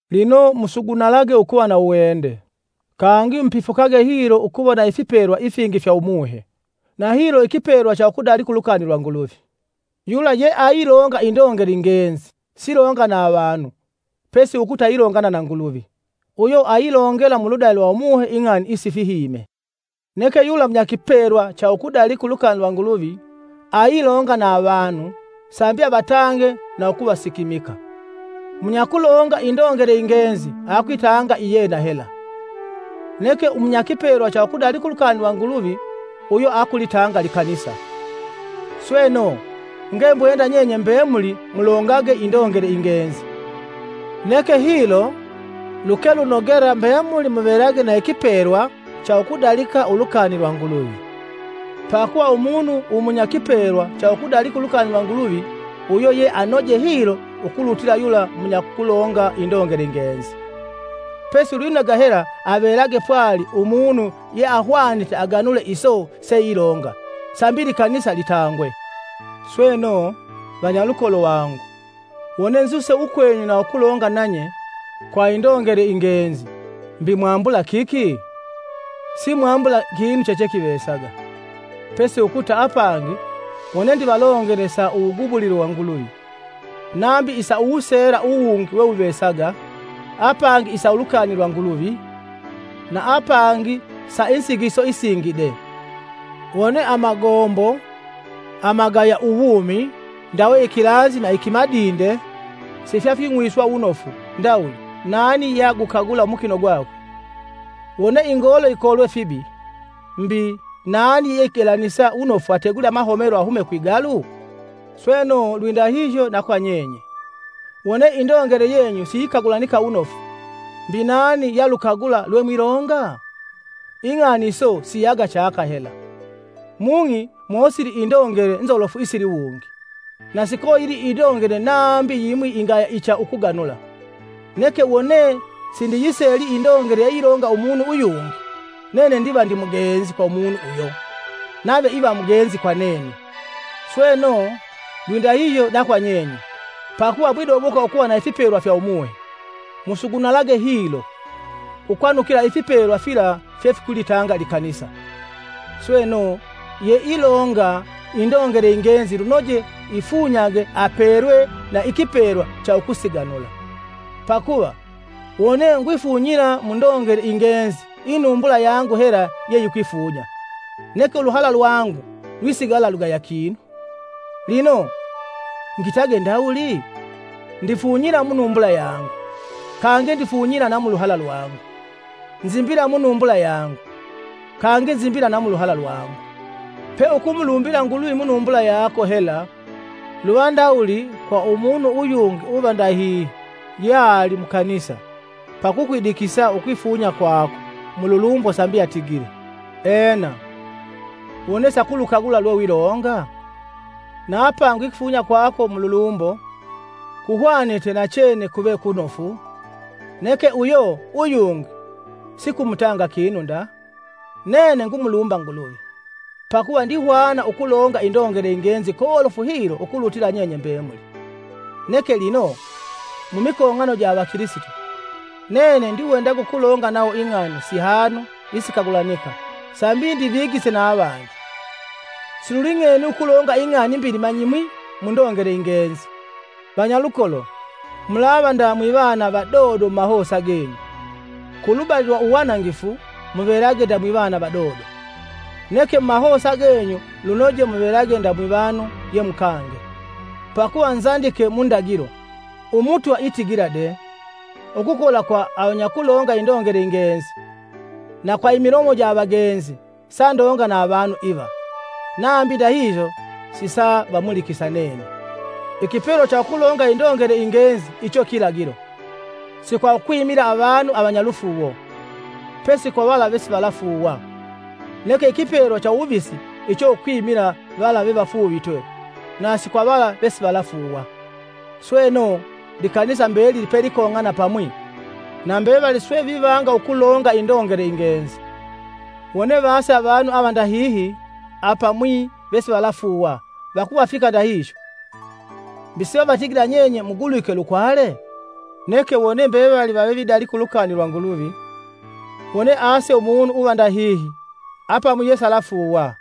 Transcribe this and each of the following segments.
Lino musugunalage ukuva na uwende. Kangi mupifukage hilo ukuva na ifipelwa ifingi fya Umuhe, na hilo ikipelwa cha ukudalika ulukani lwa Nguluvi. Yula yeailonga indongele ingenzi, silonga na avanu pesi ukuta ilongana na Nguluvi. Uyo ailongela muludali lwa Umuhe ing'ani isifihime. Neke yula munyakipelwa cha ukudalika ulukani lwa Nguluvi, ailonga na avanu sambi avatange na ukuvasikimika. Munyakulonga indongele ingenzi akwitanga iyena hela. Neke umunyakipelwa cha ukudalika ulukani lwa Nguluvi, uyo akulitanga likanisa. Sweno, ngembwenda nyenye mbemuli mulongage indongele ingenzi, neke hilo luke lunogela mbemuli muvelage na ikipelwa cha ukudalika ulukani lwa Nguluvi; pakuva umunu umunya kipelwa cha ukudalika ulukani lwa Nguluvi uyo ye anoje hilo ukulutila yula umunyakulonga indongele ingenzi, pesi lwinoga hela avelage pwali umunu yeahwanite aganule iso seilonga, sambi ilikanisa litangwe. Sweno, vanyalukolo vangu, wone nzuse ukwenyu na ukulonga nanye, kwa indongele ingenzi mbi, mwambula kiki? Simwambula ikinu chechekivesaga, pesi ukuta apangi wone ndivalongele sa uwugubulilwe wa Nguluvi, nambi isa uwuseela uwungi wewuvesaga, apangi isa ulukani lwa Nguluvi, na apangi sa inzigiso isingi de. Wone amagombo amagaya uwumi ndawe ikilanzi na ikimadinde sifyafing'wisa wunofu ndawuli nani yeagukagula umukino gwakwe. Wone ingoolo yikoolwe fibi, mbi, nani yeigelanisa wunofu ategule amahomelo ahume kwigalu? Sweno lwindahihyo na kwa nyenye, wone indongele yenyu siyikagulanika wunofu, mbi, nani yalukagula lwemwilonga? Ing'ani iso siyaga chaka hela. Mung'i mosili indongele nzolofu isiliwungi, na sikoyili indongele nambi yimwi ingaya icha ukuganula. Neke wone sindiyiseli indongele yeilonga umunu uyungi, nene ndiva ndimugenzi kwa umunu uyo, nave iva mugenzi kwa nene. Sweno, lwindahihyo na kwa nyenye, pakuva mwidoboka ukuva na ifipelwa fya Umuhe, musugunalage hilo, ukwanukila ifipelwa fila fyefikulitanga likanisa. Sweno, yeilonga indongele ingenzi lunoje ifunyage apelwe na ikipelwa cha ukusiganula. Pakuva, wone ngwifunyila mu ndongele ingenzi inumbula yangu hela ye yikwifunya, neke uluhala lwangu lwisigala lugaya kinu. Lino, ngitage ndawuli? Ndifunyila munumbula yangu, kangi ndifunyila na muluhala lwangu; nzimbila munumbula yangu, kangi nzimbila na muluhala lwangu. Peukumulumbila Nguluvi munumbula yako hela, luva ndawuli kwa umunu uyungi uva ndahihi yaali mu kanisa pakukwidikisa ukwifunya kwako mululumbo sambi atigile: “Ena,” wone sakulukagula lwewilonga? Na apangi ukwifunya kwako mululumbo kuhwanite nachene kuve kunofu, neke uyo uyungi sikumutanga kinu nda. Nene ngumulumba Nguluvi, pakuva ndihwana ukulonga indongele ingenzi kolofu hilo ukulutila nyenye mbemuli. Neke lino mumikong'ano ja avakilisito, nene ndiwendaga ukulonga nawo ing'ani sihanu isikagulanika sambi ndivigise na avangi, siluling'eni ukulonga ing'ani mbilima yimwi mundongele ingenzi. Vanyalukolo, mulava nda mwivana vadodo mumahosa genyu. Kulubali lwa uwanangifu muvelage nda mwivana vadodo, neke mu mahosa genyu lunoje muvelage nda mwivanu yemukange. Pakuva nzandike mu ndagilo: “Umutwa itigila de: ‘Ukukola kwa avanyakulonga indongele ingenzi, na kwa imilomo ja avagenzi, sandonga na avanu iva, nambi ndahihyo, sisavamulikisa nene.’” Ikipelwa cha ukulonga indongele ingenzi icho kilagilo, si kwa ukwimila avanu avanyalufuuwo, pesi kwa vala vesivalafuuwa; neke ikipelwa cha uwuvisi icho ukwimila vala vevafuuvitwe na si kwa vala vesivalafuuwa. Sweno, likanisa mbelili pelikong'ana pamwi, na mbevali swe vivanga ukulonga indongele ingenzi, wone vaase avanu ava ndahihi apamwi vesivalafuuwa vakuvafika ndahihyo, mbi sivavatigila nyenye mugulwike lukwale? Neke, wone mbevali vave vidalika ulukani lwa Nguluvi, wone aase umunu uva ndahihi apamwi yesalafuuwa,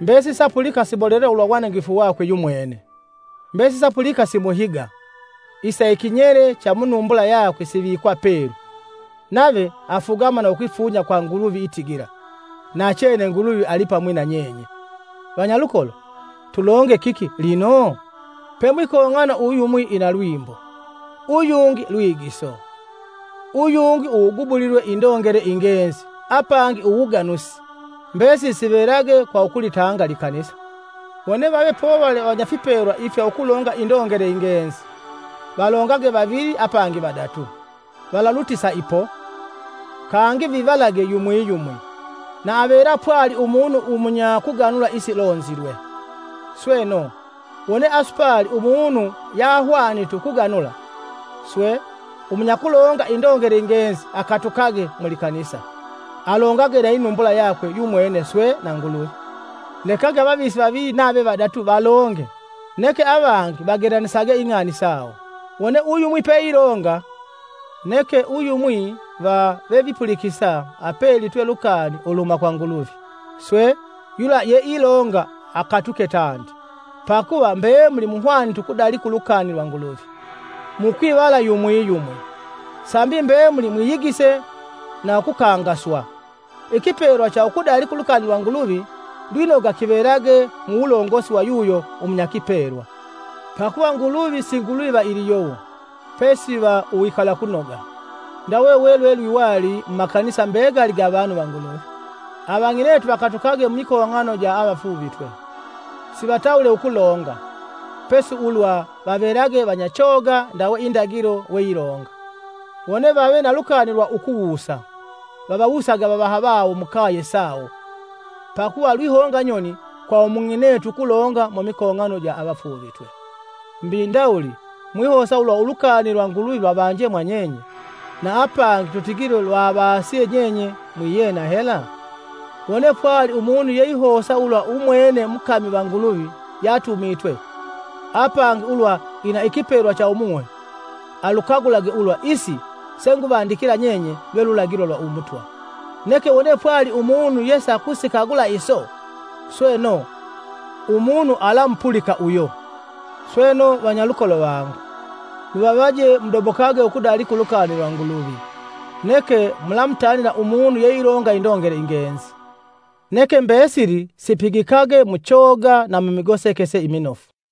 mbesili sapulika simumolelela ulwa uwanangifu wakwe yumwene; mbesili sapulika simuhiga. Isa ikinyele cha munumbula yakwe sivikwa pelu, nave afugama na ukwifunya kwa Nguluvi itigila. “Nachene Nguluvi alipamwi na nyenye.” Vanyalukolo, tulonge kiki, lino? Pemwikong'ana uyumwi ina lwimbo, uyungi lwigiso, uyungi uwugubulilwe indongele ingenzi apangi uwuganusi. Mbesili sivelage kwa ukulitanga likanisa. Wone vave povali avanyafipelwa ifya ukulonga indongele ingenzi, valongage vavili apangi vadatu, valalutisa ipo, kangi vivalage yumwi yumwi; na avela pwali umunu umunya kuganula isilonzilwe. Sweno, wone asupali umunu yahwanite ukuganula, swe, umunyakulonga indongele ingenzi akatukage mu likanisa, alongage na inumbula yakwe yumwene swe na Nguluvi. Lekage avavisi vavili nave vadatu valonge neke avangi vagelanisage ing'ani sawo. Wone uyumwi peilonga neke uyumwi va vevipulikisa apelitwe lukani uluhuma kwa Nguluvi, swe, yula yeilonga akatuke tandi. Pakuva mbemuli muhwanite ukudalika ulukani lwa Nguluvi, mukwivala yumwi yumwi; sambi mbemuli mwiyigise na ukukangaswa. Ikipelwa cha ukudalika ulukani lwa Nguluvi lwinoga kivelage muwulongosi wa yuyo umunyakipelwa. Pakuva Nguluvi si Nguluvi va iliyowo, pesi va uwikalakunoga. Ndawe welwelwiwali mu makanisa mbegali ga avanu va Nguluvi, avang'inetu vakatukage mu mikong'ano ja avafuuvitwe. Sivatawule ukulonga; pesi ulwa vavelage vanyachoga ndawe indagilo weyilonga. Wone vave na lukani lwa ukuwusa, vavawusage avavaha vawo mukaye sawo, pakuva lwihonga nyoni kwa umung'inetu ukulonga mu mikong'ano ja avafuuvitwe. Mbi, ndawuli mwihosa ulwa ulukani lwa Nguluvi lwavanje mwa nyenye, na apangi tutigile lwavasye nyenye mwiyena hela? Wone pwali umunu yeihosa ulwa Umwene mukami va Nguluvi yatumitwe, apangi ulwa ina ikipelwa cha Umuhe, alukagulage ulwa isi senguvandikila nyenye lwe lulagilo lwa Umutwa. Neke wone pwali umunu yesakusikagula iso, sweno, umunu alamupulika uyo. Sweno, vanyalukolo vangu, luvavaje mudobokage ukudalika ulukani lwa Nguluvi; neke mulamutanila umunu yeilonga indongele ingenzi. Neke mbesili sipigikage mu choga na mumigosekese iminofu.